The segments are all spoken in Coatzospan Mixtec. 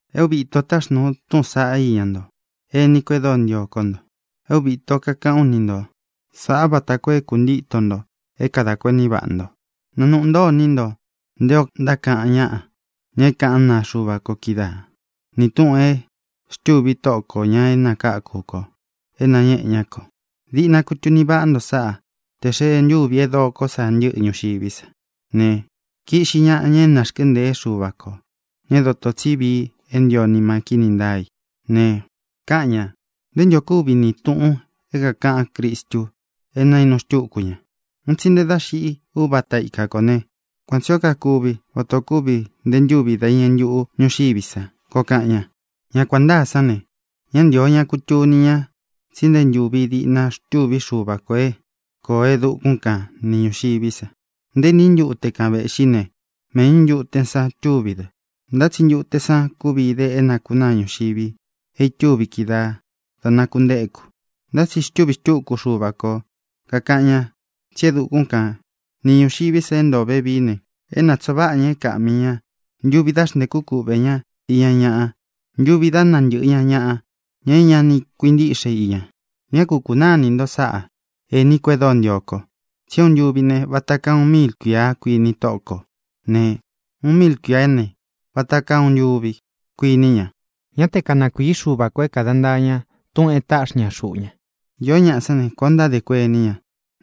É uvi īto táxnūu u túꞌūn san íña nto, ení ko e dóo ntio kó nto. É uvi īto kakaꞌán u ni nto sāꞌá vata koo é kuntitō nto é kadā kuení vaꞌa nto. Nanūꞌu ntó iní nto nté ō ntákaꞌan ñáꞌa, ña é kaꞌán naa Xuva ko kídaa, ni tūꞌun e xtûvi Tóꞌo kō, ña é nakáku kō, é nañéꞌe ñá kō. Diꞌna kutuni vaꞌá nto sáꞌa: tē xee ntúvi é dokó sa ntɨ́ꞌɨ ñuxiví san ne, kiꞌxi ñaꞌa ña é narkɨ́ntēé Xuva kō, ña é dotō tsí vii é ntio nima kíni ntáa í ne, káꞌan ñā: “¿Nté ntu ō kúvi ni tūꞌun é kākaꞌán Cristu é nainu xtúku ña? Un tsi nte dá xiꞌi úvata ika kō né, kuan tsī ó kakuvi vata ō kúvi nte ntúvi dá iñɨ ntuꞌu ñūxiví sa”, koo kaꞌan ña. Ña kuān ntáa sán ne, ñá ntīo ña kutuni ñá tsi nté ntūvi diꞌna xtûví Xuva kō é kōo e dukún kan ni ñūxiví sa. Nté iní ntute kan vēꞌxí ne, méꞌñū ntute san túvi dɨ. Ntá tsi ntute san kúvi ide é nakunáa ñuxivi e itúvi kídaā dá nākuntéku. Ntá tsi xtûví xtuku Xuva ko, kākaꞌan ña tsí e dukún kan ni ñūxiví sa é ntoo vevií ne, é natsoo vaꞌa ña é kāꞌmi ña ntuvi dá xntēkú kuꞌvē ñá iña ñaꞌa, ntuvi dá nantɨꞌɨ ña ñaꞌa, ña é ña ni kuintíꞌxe i ña. Ñá ku kūnaá ini nto sáꞌa, ēní ko e dóo ntio ko, tsi é uun ntuvi ne, vata kaa uun míil kuīa, kuini Tóꞌo kō ne, uun míil kuīá ne, vata kaa uun ntuvi, kuiní ña. Ñá te kanakuīí Xuva kō é kāda ntaa ña túꞌūn e táꞌxi ña xuꞌu ña. Īó ñaꞌa sán ne, kuān o ntádē kuení ña.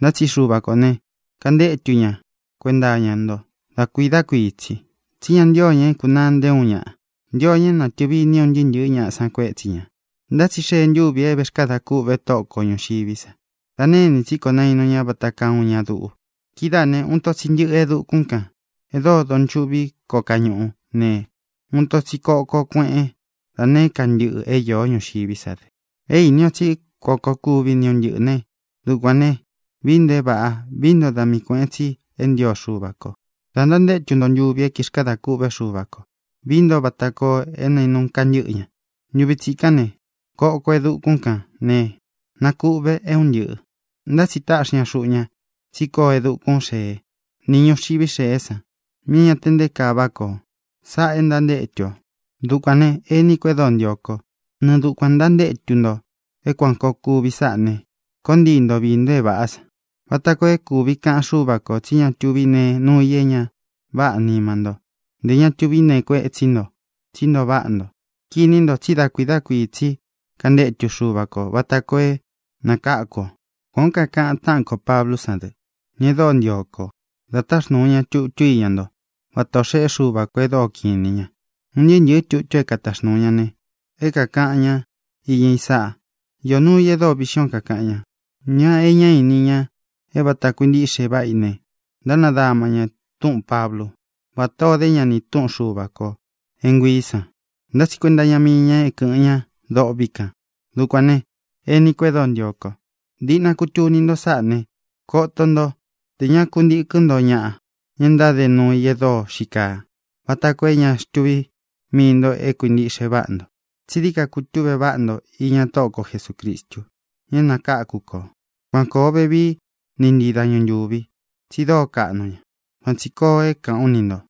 Ntá tsi Xuva kō ne, kantétu ña kuenta iña nto dá kuiī dá kuii tsī, tsí ña ntío ña é kūnaa nté uun ñaꞌa. Ntio ña é natɨ̄vi iní un ntɨɨ́ ntɨ̄ɨ́ ñaꞌa san kuétsi ñā. Ntá tsi xee ntúvi te vēxkada kûꞌve Tóꞌo ko ñūxiví sa. Da née ini tsí kō nainu ña vata kaa uun ña duꞌu. Kidáā né, uun ito tsi ntɨꞌɨ e dukún kān é dóo donchuꞌví koo kañúꞌu ne, uun ito tsi koko kueꞌén da nēé ka ntɨꞌɨ é īó ñuxiví sa dɨ. É īni o tsí kuan koo kuvi nī é un ntɨꞌɨ̄ né, ¡dukuān ne, vií nto é vāꞌá, vií nto da mii kuēꞌen tsi é ntio Xuva kō da ntantétu nto ntuvi é ntixkada kûꞌvé Xuva kō! Vií nto vata koo é nainu kantɨ́ꞌɨ ña. Ntuvi tsikán ne, koko e dukún kān ne, nakuꞌve é un ntɨꞌɨ̄. Ntá tsi táꞌxi ña xuꞌu ña tsí koo e dukún xēé ni ñuxiví xēé san, míꞌī é ña te nté kaa váꞌa koo. Sáꞌā e ntántétu ō. Dukuān ne, ení ko e dóo ntio kó, nɨɨ dukuān ntantétu nto é kuān koo kuvi sáꞌā né, koo ntii nto viī nto é vāꞌá san vata koo é kuvi kaꞌan Xúva kō tsí ña tuví nee nuu i é ña váꞌā nima ntó, ntē ña tuví nee kuétsi ntō, tsí ntoo váꞌa nto. Kiní nto tsí da kuiī dá kuii tsi kāntétu Xuva kō vata koo é nakáku ō. Kuān ó kakaꞌan táꞌan kō Pablú san dɨ, ña e dóo ntio ko, da táxnūu ña tutú iña ntó, vata ō xeꞌé Xuva kō e dóo kiꞌin inī ña. Un ntɨɨ́ ntɨ̄ɨ́ tutu é kataxnūu ña ne, é kākaꞌan ñá iña i sáꞌa. Īó nuu i e dóo viꞌxín ō é kākaꞌan ña. Ña e ñá ini, ña é vāta kuintiꞌxe váꞌa i ne, ntánadama ña túꞌūn Pablu, vátā ó de ña ni tūꞌún Xuva kō é nguiī san. Ntá tsi kuenta iña mii ña é kɨ̄ꞌɨn ña dôꞌvi kan. Dukuān ne, ení ko e dóo ntio kó, diꞌna kutuni nto sáꞌā ne, koto nto te ña kuntíkɨn nto ñaꞌa, ña e ntáde nuu i e dóo xii kaa, vata koo é ña xtuví mii nto é kuīntiꞌxe váꞌa nto, tsi dií dií ka kutuꞌve nto iña Tóꞌo ko Jesūcristu, ña é nakáku kō. Káꞌan ō vevií ni ntii dañu ntūvi tsi dóo kaꞌnu ña. Kuan tsī koo é kāꞌán u ni ntō.